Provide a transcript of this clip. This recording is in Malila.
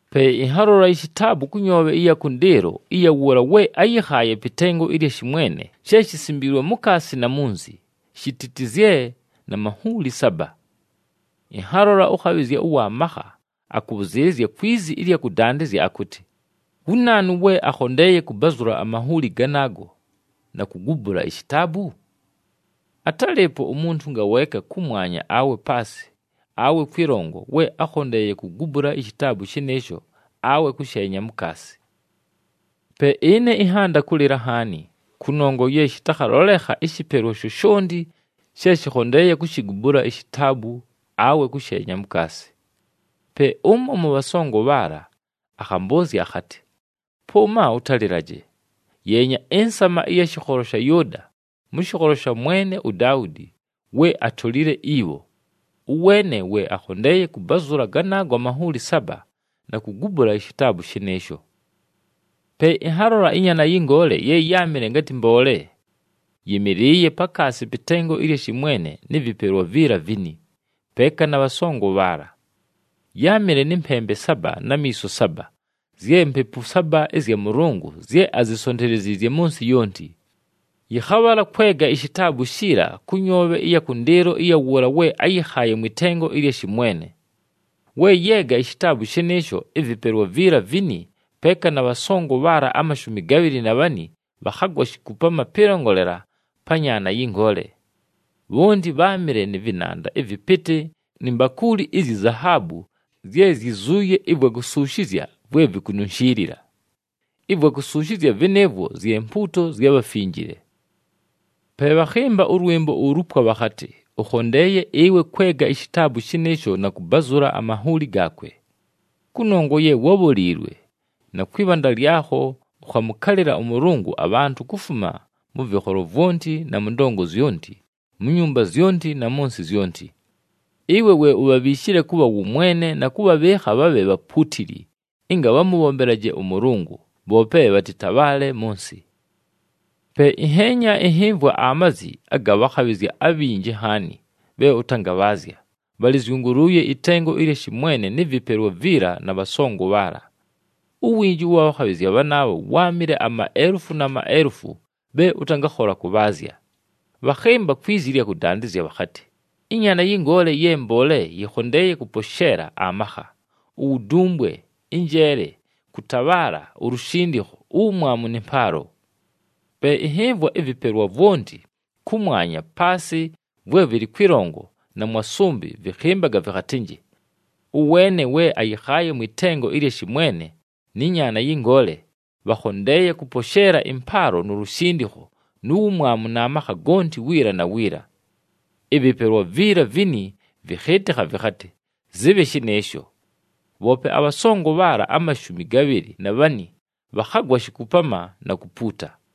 Pe ɨnhalola ishitaabu kʉ nyoobhe ɨya kʉndɨɨlo ɨya wʉʉla we áyɨkhaaye pɨ tengo ɨlya shɨmwene, she shisimbiilwe mukaasi na munzi, shititizye na manhuuli saba. Ɨnhalola ʉkhabhɨzya ʉwa makha, akʉbhʉzɨɨlɨzya kwi zi ɨlya kʉdandɨzya akʉtɨ, “Wu naanu we akhondeeye kʉbazʉla amanhuuli ganaago na kugubula ishitaabu?” Atálɨɨpo umuntu ngaweeka, kʉmwanya awe paasɨ awe kwɨlongo, we ákhondeeye kugubula ishitaabu shɨnɨɨsho awe kʉsheenya mukaasi. Pe ɨne ɨnhanda kʉlɨla nhaani, kʉnongwa ye shɨtakhalolekha ɨshɨpelwa shoshonti she shɨkhondeeye kushigubula ishitaabu awe kʉsheenya mukaasi. Pe ʉmo mʉ bhasongo bhaala akhambʉʉzya akhatɨ, “Pʉʉma ʉtalɨlaje! Yeenya, ɨNsama ɨya shɨkholo sha Yʉʉda, mʉ shɨkholo sha mwene uDaudi, we atolile ibho. Ʉweene we akhondeeye kʉbazʉla ganaago amanhuuli saba, na kugubula ishitaabu shɨnɨɨsho.” Pe ɨnhalola ɨNyaana yɨ Ngoole ye yáamɨle ngatɨ mboole. Yɨmɨlɨɨye pakaasi pɨ tengo ɨlya shɨmwene nɨ vɨpelwa viila vini, peeka na bhasongo bhaala. Yáamɨle nɨ mpembe saba na miiso saba, zye Mpepu saba ɨzya Mʉlʉngʉ zye azisonteleziizye mʉ nsɨ yonti. Yɨkhabhala kwega ishitaabu shiila kʉ nyoobhe ɨya kʉndɨɨlo ɨya wʉʉla we áyɨkhaaye mwɨ tengo ɨlya shɨmwene. We yeega ishitaabu shɨnɨɨsho, ɨvɨpelwa viila vini peeka na bhasongo bhaala amashumi gabhɨlɨ na bhani bhakhagwa shikupama pɨlongolela pa Nyaana yɨ Ngoole. Bhonti bháamɨle nɨ vɨnanda ɨvɨpɨtɨ ni mbakuuli izyi zahaabu zye zyizuuye ɨvwa kusuushizya vwe vikununshiilila. Ɨvwa kusuushizya vɨnɨɨvwo zye mpuuto zya bhafinjile. Pe bhakhɨmba ʉlwɨmbo ulupwa bhakhatɨ, “Ʉkhondeeye ɨwe kwega ishitaabu shɨnɨɨsho na kʉbazʉla amanhuuli gaakwe. Kʉnongwa ye wábholiilwe, na kwɨ bhanda lyakho ʉkhamʉkalɨla ʉMʉlʉngʉ, abhantʉ kufuma mʉ vɨkholo vwonti na mʉ ndongo zyonti, mu nyumba zyonti na mʉ nsɨ zyonti. Ɨwe we ubhabhiishile kʉbha wʉmwene na kʉbhabhɨɨkha bhabhe bhapuutili, ɨnga bhamʉbhombelaje ʉMʉlʉngʉ, bhoope bhatɨtabhaale mʉ nsɨ.” Pe ɨnheenya, ɨnhɨmvwa amazi aga bhakhabhɨzya abhinji nhaani bhe ʉtangabhaazya, bhalɨzyʉngʉlʉʉye ɨtengo ɨlya shɨmwene nɨ vɨpelwa viila na bhasongo bhaala. Uwinji ʉwa bhakhabhɨzya bhanaabho wáamɨle amaelufu na maelufu bhe ʉtangakhola kʉbhaazya. Bhakhɨmba kwi zi ɨlya kʉdandɨzya bhakhatɨ, “ƗNyaana yɨ Ngoole ye mboole yɨkhondeeye kʉposheela amakha, uwudumbwe, ɨnjeele, kʉtabhaala, ulushindikho, uwumwamu nɨ mpaalo!” Pe ɨnhɨmvwa ɨvɨpelwa vwonti kʉmwanya, paasɨ, vwe vɨlɨ kwɨlongo, na mwa sʉmbɨ vɨkhɨmbaga, vɨkhatɨnjɨ, “Ʉweene we ayɨkhaaye mwɨ tengo ɨlya shɨmwene, nɨ Nyaana yɨ Ngoole, bhakhondeeye kʉposheela ɨmpaalo nu lushindikho nu wumwamu na makha gonti wiila na wiila.” Ɨvɨpelwa viila vini vɨkhɨɨtɨkha, vɨkhatɨ, “Zɨbhe shɨnɨɨsho!” Bhoope abhasongo bhaala amashumi gabhɨlɨ na bhani bhakhagwa shikupama na kupuuta.